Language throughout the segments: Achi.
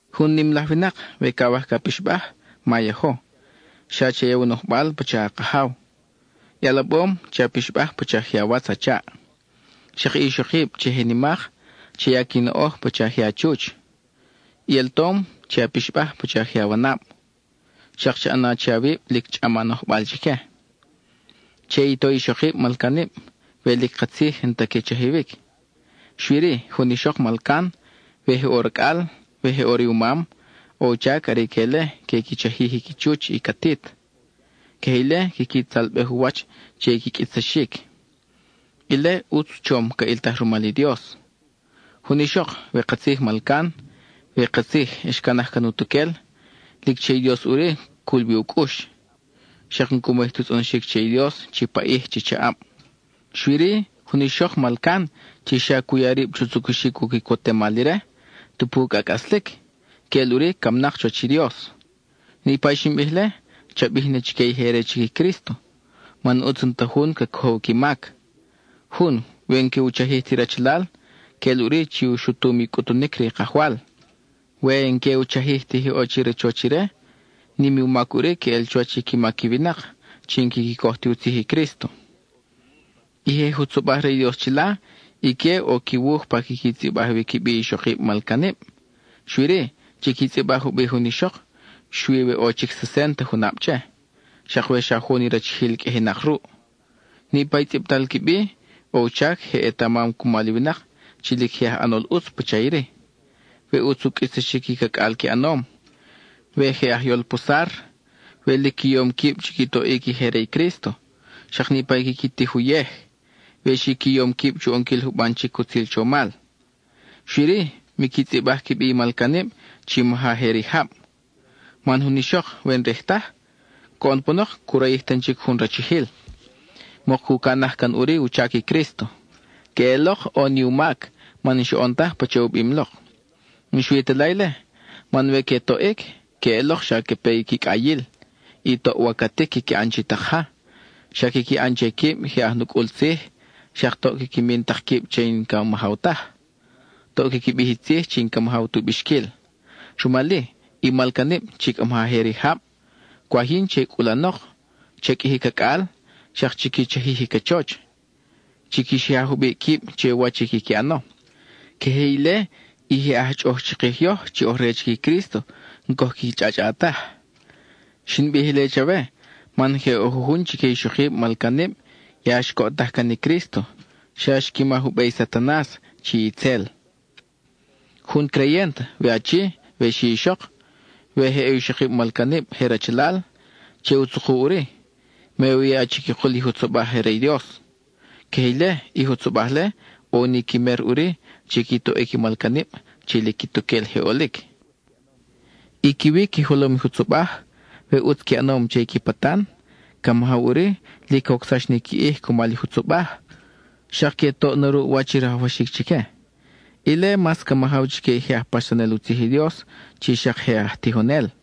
Jun nim laj winak, we cawaj ca pixbaj, ma yajo, xa cha ya u nojbal pacha a kajaw. I alabom, che a pixbaj pacha je awatz a chaʼ. Xak i ixokib chi je nimak, cha ya qui noʼoj pacha je a chuch. I altom, che a pixbaj pacha je awanab, xak cha ʼana che awib lic chʼam a nojbal chique. Che i to i ixokib malcanib we lic katzij n-ta que chajiwic. Xui-ri, jun ixok malcan, we je ʼo racʼal, we je ʼo riumam, ʼo u chac are ique-le que qui chajij i qui chuch, i catit. Queje ile, quiqui tzalbej u wach che i qui qʼuitsaxic. Ile ʼutz chom ca ʼiltaj rumal i Dios. Jun ixok, we katzij malcan, we katzij xcanaj can utuquel, lic che i Dios ʼuri cul wi u cʼux, xak n-cu mayij tu tzʼonoxic che i Dios chi paʼij, chi chaʼab. Xui-ri, jun ixok malcan chi xa cu ya rib chu tzucuxic u quicotemal ire, tupu cʼa cʼaslic, queʼel ʼuri camnak chuwach i Dios. Niʼpa i xin bij-le, cha bij na chique i je re chic i Crísto, man ʼutz n-ta jun ca cojow qui mac. Jun, we n-que u chajij ti rachalal, queʼel ʼuri chi u xutum i cʼutunic re i Kajwal; we n-que u chajij ti je ʼo che i rachoch ire, nim ni u mac ʼuri queʼel chuwach i qui mac i winak chi n-quiqui coj ti u tzij i Crísto. I je jutzobaj re i Dios chila, ique ʼo qui wuj pa quiqui tzʼibaj wi qui bi ixokib malcanib. Xui-ri, chiqui tzʼibaj u bi jun ixok xui we ʼo chic sesent junab che, xak we xa jun i rachijil qʼuijinak ruʼ. Niʼpa i tzʼibal qui bi, ʼo u chac je ʼetamam cumal i winak chi lic je aj ʼanol ʼutz pacha iri: we ʼutz u qʼuitsaxic i cacʼal qui ʼanom, we je ajyol posar, we lic qui yom quib chi qui toʼic i je re i Crísto, xak niʼpa i quiqui tij uyej; we xi qui yom quib chu ʼonquil juban chic utzil chomal. Xui-ri, miqui tzʼibaj qui bi i malcanib chi maja je rijab. Man jun ixok we n-rij taj, coʼon panok cu rayij tan chic jun rachijil, mok cu canaj can ʼuri u chac i Crísto. Queʼelok ʼo ni u mac, man n-xoʼon taj pacha u bim lok. N-xui ta la ile, man we que toʼic, queʼelok xa ca pe qui cʼayil, y toʼ wacatic quiqui ʼan chi tak ja, xak quiqui ʼan che quib je aj nucʼul tzij, xak toʼ quiqui min tak quib che i n-ca majaw taj; toʼ quiqui bij i tzij chi n-ca majaw tu bixquil. Rumal-i, i malcanib chi cʼa maja je rijab, cwaj yin che cʼulanok, cha qʼuiji cacʼal, xak chiqui chajij i cachoch. Chiqui xija jubiʼ quib che wach quiqui ʼano; queje ile, i je aj chʼoʼoj chikij yoj chi oj re chic i Crísto n-coj qui chʼachʼa taj. Xin bij ile chawe man je ʼo jujun chique i ixokib malcanib ya xcoʼtaj can i Crísto, xa xqui maj u be i Satanas, chi itzel. Jun creyent, we achi we xi ixok, we je ʼo ixokib malcanib je rachalal, che u tzuku ʼuri; me u ya chiquikul i jutzobaj je re i Dios. Queje ile, i jutzobaj-le ʼo ni qui mer ʼuri chi qui toʼic i malcanib chi lic quituquel je ʼolic. I qui wi qui jolom i jutzobaj, we ʼutz qui ʼanom che i qui patan, ca majaw ʼuri lic cocsax ni qui ʼij cumal i jutzobaj, xak que toʼ na ruʼ wach i rajwaxic chique; ile mas ca majaw chique i je aj paxsanel u tzij i Dios chi xak je aj tijonel.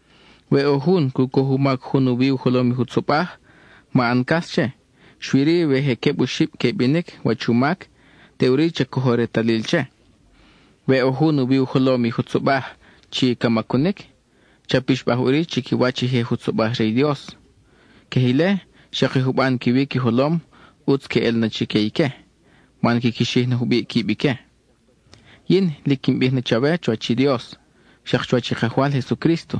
We ʼo jun cu coj u mac jun u wi u jolom i jutzobaj, ma ʼan cas che, xui-ri we je queb oxib que binic wach u mac, teʼuri cha cojo retalil che. We ʼo jun u wi u jolom i jutzobaj chi ca macunic, cha pixbaj ʼuri chiquiwach i je jutzobaj re i Dios. Queje ile, xak i juban qui wi qui jolom, ʼutz queʼel na chique man quiqui xij na jubiʼ quib ique. Yin lic quin bij na chawe chuwach i Dios, xak chuwach i Kajwal Jesucrísto,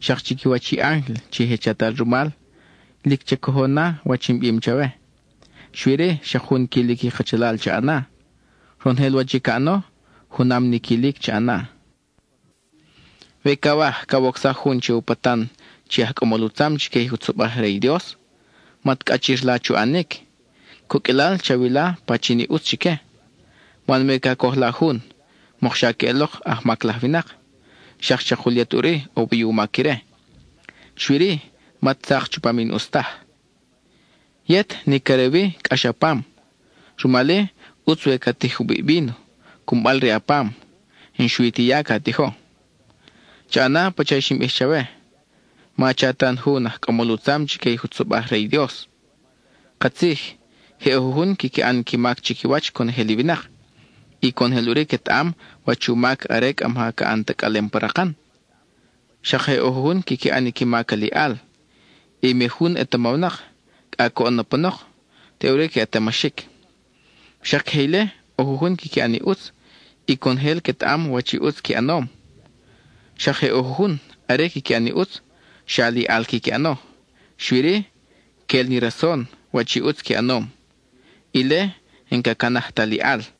xak chiquiwach i ángel chi je chatal rumal, lic cha cojo na wach in bim chawe. Xui-ri, xak jun quilic i kachalal cha ʼana; ronojel wach i ca ʼano, junam ni quilic cha ʼana. We cawaj cawocsaj jun che u patan chi aj cʼamol u tzam chique i jutzobaj je re i Dios, mat cʼachir la chu ʼanic; coqʼuilal chawila pachin i ʼutz chique. Man we ca coj la jun, mokxa queʼelok ajmac laj winak, xak chakul yet ʼuri ʼo wi u mac ire. Xui-ri, mat tzak chupam i n-ʼus taj. Yet, nic are wi, cʼax a pam. Rumal-i, ʼutz we ca tij jubiʼ i víno, cunbal re a pam, n-xui ti ya ca tijo. (Cha ʼana pacha i xin bij chawe: ma cha tan jun aj cʼamol u tzam chique i jutzobaj je re i Dios.) Katzij je ʼo jujun quiqui ʼan i qui mac chiquiwach conojel i winak, y conojel ʼuri quetaʼam wach u mac are cʼa maja ca ʼan tacʼalem pa rakan. Xak je ʼo jujun quiqui ʼan qui mac aliʼal, y mi jun ʼetamawnak, cʼa coʼon na panok, teʼuri ca ʼetamaxic. Xak queje ile, ʼo jujun quiqui ʼan i ʼutz y conojel quetaʼam wach i ʼutz qui ʼanom. Xak je ʼo jujun, are quiqui ʼan i ʼutz, xa aliʼal quiqui ʼano, xui-ri, quel ni rason wach i ʼutz qui ʼanom; ile n-ca canaj ta aliʼal.